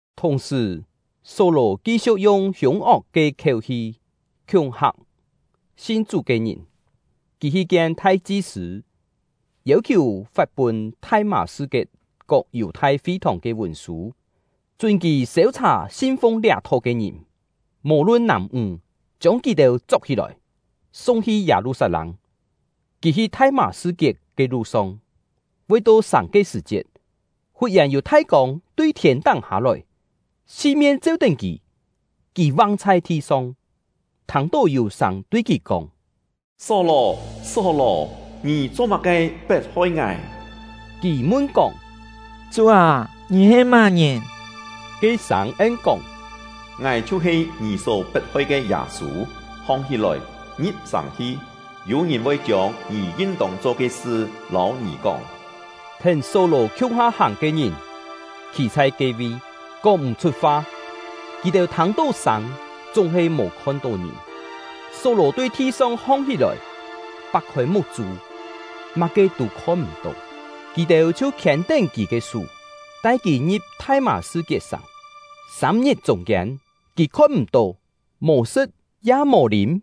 Thùng-sṳ̀, Só-lò ki-siu̍k yung hiûng-ok ke khiéu-hi khiúng-hak sin Chú ke ngìn. Kì hi kien thai-chi-sṳ̂, yêu-khiù fat pûn Thai-mâ-sṳ-kiet kok Yù-thai fi-thòng ke vùn-sû, chún kì sêu-chhà sin-fung liá Tho ke ngìn, mò-lun nàm-ńg, chiông kì-têu chok-hí-lòi, sung-hi Yâ-lu-sat-lâng. Kì hi Thai-mâ-sṳ-kiet ke lu-song, voi to sàng ke sṳ̀-chiet, fut-yèn yû thai kông tui thiên-táng hâ-lòi, si-mien cheu-tén kì. Kì vang chhai thi-song, thâng-tó yû sâng tui kì kóng: “Só-lò, Só-lò! Ngì cho-má-ke pet-hoi ngài?” Kì mun-kóng: “Chú â, ngì he má-ngìn?” Ke sâng en-kóng: “Ngài chhiu-he ngì só pet-hoi ke Yâ-sû. Hong-hí-lòi, ngi̍p sàng hi, yû-ngìn voi chiông ngì yin-tông cho ke sṳ lâu ngì kóng.” Thèn Só-lò khiung-ha hàng ke ngìn khî chhai ke-vi, kóng m̀-chhut fa; kì-têu thâng-tó sâng, chúng-he mò khon-tó ngìn. Só-lò tui thi-song hong-hí-lòi, pak-khôi muk-chû, má-ke tû khon-m̀-tó. Kì-têu chhiu khiên-tén kì ke sú, tai kì ngi̍p Thai-mâ-sṳ-kiet-sàng. Sâm-ngit chûng-kiên, kì khon-m̀-tó; mò sṳ̍t, ya mò lîm.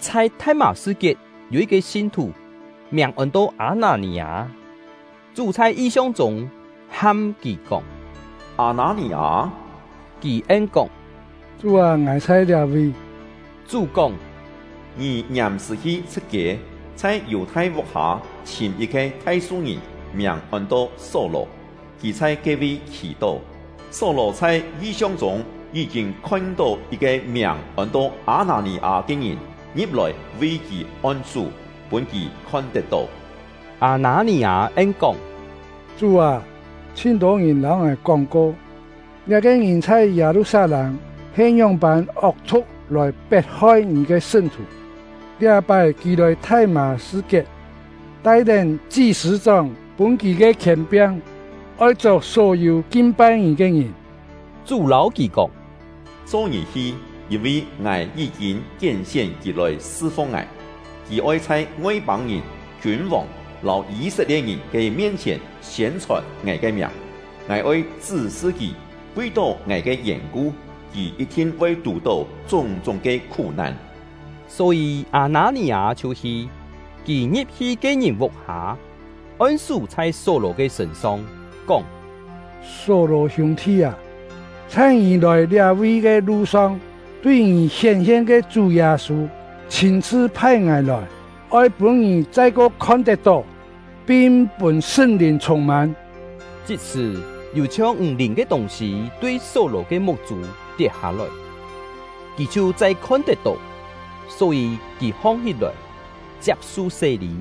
Chhai Thai-mâ-sṳ-kiet yû yit-ke sin-thù, miàng ôn-to Â-nâ-nì-â. Chú chhai yi-siong chûng ham kì kóng: “Â-nâ-nì-â!” Kì en-kóng: “Chú â, ngài chhai liá-vi.” Chú kóng: “Ngì ngiàm-sṳ̀ hi Chhṳ̍t-kiê, chhai Yù-thai vuk-hâ chhìm yit-ke Thai-su-ngìn, miàng ôn-to Só-lò. Kì chhai ke-vi khì-tó; Só-lò chhai yi-siong chûng yí-kîn khon-tó yit-ke miàng ôn-to Â-nâ-nì-â ke ngìn, ngi̍p-lòi vi kì on-sú, pûn kì khon tet-tó.” Â-nâ-nì-â en-kóng: “Chú â, chhin-tô ngìn lâu ngài kóng-ko, liá-ke ngìn chhai Yâ-lu-sat-lâng he ngióng-pân ok-thu̍k lòi pet-hoi Ngì ke sṳn-thù. Liá-pái kì lòi Thai-mâ-sṳ-kiet, tai-tén chi-sṳ̂-chóng pûn kì ke khièn-piang, oi chok só-yû kin-pai Ngì ke ngìn.” Chú lâu kì kóng: “Cho ngì hi! Yîn-vi Ngài yí-kîn kién-sién kì lòi sṳ-fung Ngài. Kì oi chhai Ngoi-pâng-ngìn, kiûn-vòng, lâu Yî-set-lie̍t-ngìn ke mien-chhièn siên-chhòn Ngài ke miàng. Ngài oi chṳ́-sṳ kì, vi-tó Ngài ke yèn-ku, kì yit-thin voi tù-tó chúng-chúng ke khú-nan.” Só-yî Â-nâ-nì-â chhiu hi. Kì ngi̍p-hi ke-ngìn vuk-hâ, on-sú chhai Só-lò ke sṳ̂n-song, kóng: “Só-lò hiûng-thi â, chhai ngì lòi liá-vi ke lu-song tui ngì hién-hien ke Chú Yâ-sû chhîn-chhṳ phai ngài lòi, oi pûn ngì chai-ko khon tet-tó, pin pûn Sṳn-Lìn chhûng-mân.” Chit-sṳ̀, yû chhiong ǹg-lìn ke tûng-sî tui Só-lò ke muk-chû tiet-hâ-lòi, kì chhiu chai khon-tet-tó. Só-yî kì hong-hí-lòi, chiap-su sé-lî;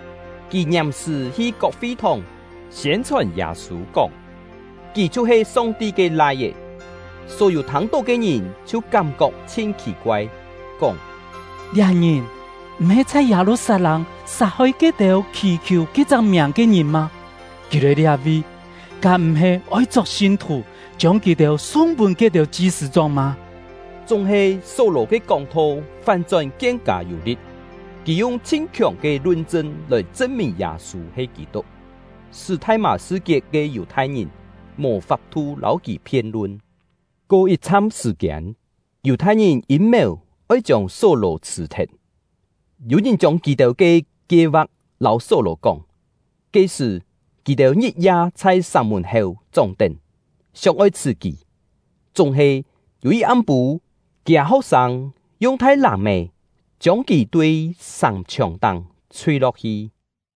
Kì ngiàm-sṳ̀ hi kok fi-thòng siên-chhòn Yâ-sû, kóng: “Kì chhiu-he Song-ti ke Lai-é.” Só-yû thâng-tó ke ngìn chhiu kám-kok chhin khì-koai, kóng: “Liá ngìn m̀-he chhai Yâ-lu-sat-lâng sat-hoi ke-têu khì-khiù ke-chak miàng ke ngìn mâ? Kì lòi liá-vi, kám m̀-he oi chok sin-thù, chiông kì-têu sung pûn ke-têu chi-sṳ̂-chóng mâ?” Chúng-he Só-lò ke kóng-tho fán-chón kien-kâ yû li̍t; kì yung chhin khiòng ke lun-chṳn lòi chṳn-mìn Yâ-sû he Kî-tuk, sṳ́ Thai-mâ-sṳ-kiet ke Yù-thai-ngìn mò fap-thu lâu kì phien-lun. Ko yit-chham sṳ̀-kiên, Yù-thai-ngìn yîm-mèu oi chiông Só-lò chhṳ̀-thet. Yû ngìn chiông kì-têu ke kie-va̍k lâu Só-lò kóng. Ke-sṳ̀, kì-têu ngit-ya chhai sàng-mùn-héu chóng-tén, sióng-oi chhṳ̀ kì. Chúng-he, yû yit am-pû, kiâ ho̍k-sâng yung thai làm-è chiông kì tui sàng-chhiòng-táng chhui-lo̍k-hi.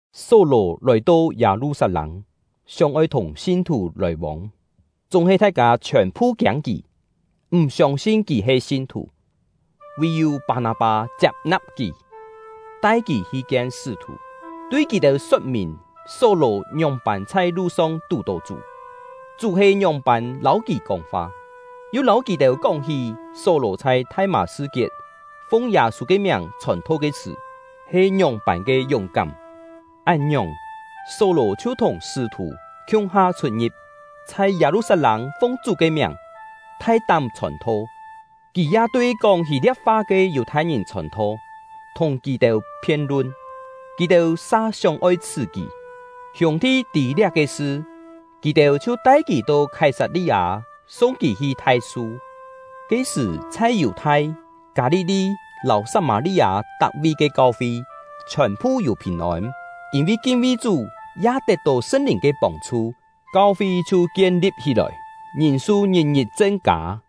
Só-lò lòi-to Yâ-lu-sat-lâng, sióng-oi thùng sin-thù lòi-vông; chúng-he thai-kâ chhiòn-phu kiâng kì, m̀ siông-sin kì he sin-thù. Vì-yû Pâ-nâ-pâ chiap-na̍p kì, tai kì hi kien sṳ́-thù, tui kì-têu sot-mìn Só-lò ngióng-pân chhai lu-song tù-tó Chú, Chú he ngióng-pân lâu kì kóng-fa, yu lâu kì-têu kóng-hí Só-lò chhai Thai-mâ-sṳ-kiet fung Yâ-sû ke miàng chhòn-tho ke sṳ̀ he ngióng-pân ke yúng-kám. Án-ngiòng, Só-lò chhiu thùng sṳ́-thù khiung-ha chhut-ngi̍p, chhai Yâ-lu-sat-lâng fung Chú ke miàng thai-tám chhòn-tho. Kì ya tui kóng Hî-lia̍p-fa ke Yù-thai-ngìn chhòn-tho, thùng kì-têu phien-lun; kì-têu sa sióng-oi chhṳ̀ kì. Hiûng-thi tî liá-ke sṳ, kì-têu chhiu tai kì to Khái-sat-li-â, sung kì hi Thai-su. Ke-sṳ̀, chhai Yù-thai, Kâ-li-li, lâu Sat-mâ-li-â tak-vi ke kau-fi, chhiòn-phu yû phìn-ôn. Yîn-vi kin-vi Chú, ya tet-tó Sṳn-Lìn ke pông-chhu, kau-fi chhiu kien-li̍p hí-lòi, ngìn-su ngit-ngit chen-kâ.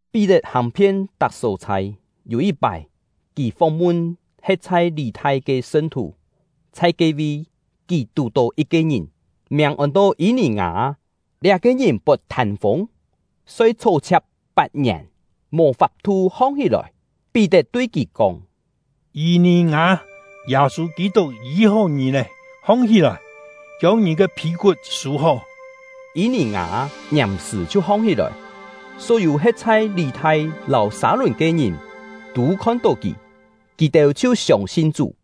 Pí-tet hàng-phien tak só-chhai. Yû yit-pái, kì fóng-mun he̍t chhai Lî-thai ke sṳn-thù; chhai ke-vi, kì tù-tó yit-ke ngìn, miàng ôn-to Yî-nì-ngâ. Liá-ke ngìn pot thân-fûng, soi chhó-chhia̍k pat-ngièn, mò fap-thu hong-hí-lòi. Pí-tet tui kì kóng: “Yî-nì-ngâ, Yâ-sû Kî-tuk yî-hó ngì lé. Hong-hí-lòi, chiông ngì ke phî-kut sû-hó!” Yî-nì-ngâ ngiàm-sṳ̀ chhiu hong-hí-lòi. Só-yû he̍t chhai Lî-thai lâu Sâ-lùn ke ngìn tû khon-tó kì, kì-têu chhiu siông-sin Chú.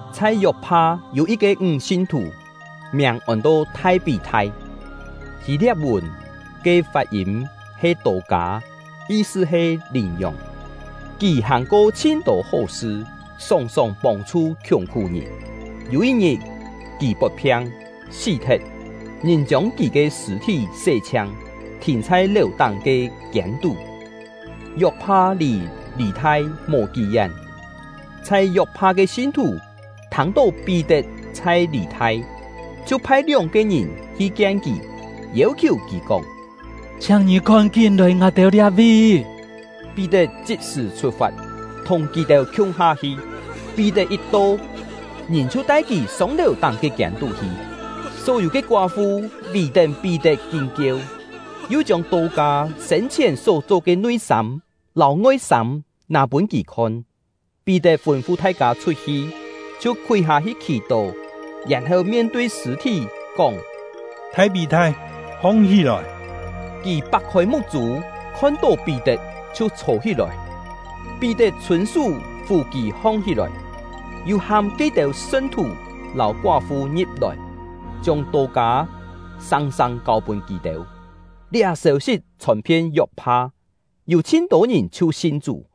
Chhai Yok-pha yû yit-ke ńg sin-thù, miàng ôn-to Thai-pí-thai (Hî-lia̍p-vùn ke fat-yîm he Tô-kâ, yi-sṳ he “Lìn-yòng”). Kì hàng-ko chhin-tô hó-sṳ, sòng-sòng pông-chhu khiùng-khú-ngìn. Yû yit-ngit, kì pot phiang, sí-thet. Ngìn chiông kì ke sṳ̂-thí sé-chhiang, thìn chhai lèu-táng ke kiên-tú. Yok-pha lì Lî-thai mò kí-yén. Chhai Yok-pha ke sin-thù thâng-tó Pí-tet chhai Lî-thai, chhiu phai lióng-ke ngìn hi kien kì, yêu-khiù kì kóng: “Chhiáng ngì kón-kín lòi ngài-têu liá-vi!” Pí-tet chit-sṳ̀ chhut-fat, thùng kì-têu khiung-ha hi. Pí-tet yit to, ngìn chhiu tai kì sông lèu-táng ke kiên-tú hi. Só-yû ke koá-fu vì-tén Pí-tet kín kieu, yu chiông Tô-kâ sên-chhièn só-cho ke nui-sâm lâu ngoi-sâm nâ pûn kì khon. Pí-tet fûn-fu thai-kâ chhut-hi, chhiu khúi hâ-hi khì-tó, yèn-heu mien-tui sṳ̂-thí, kóng: “Thai-pí-thai, hong-hí-lòi!” Kì pak-khôi muk-chû, khon-tó Pí-tet, chhiu chhô-hí-lòi. Pí-tet chhûn-sú fù kì hong-hí-lòi, yu ham ke-têu sṳn-thù lâu koá-fu ngi̍p-lòi, chiông Tô-kâ sâng-sâng kâu-pûn kì-têu. Liá sêu-sit chhòn-phien Yok-pha, yû chhin-tô ngìn chhiu sin Chú.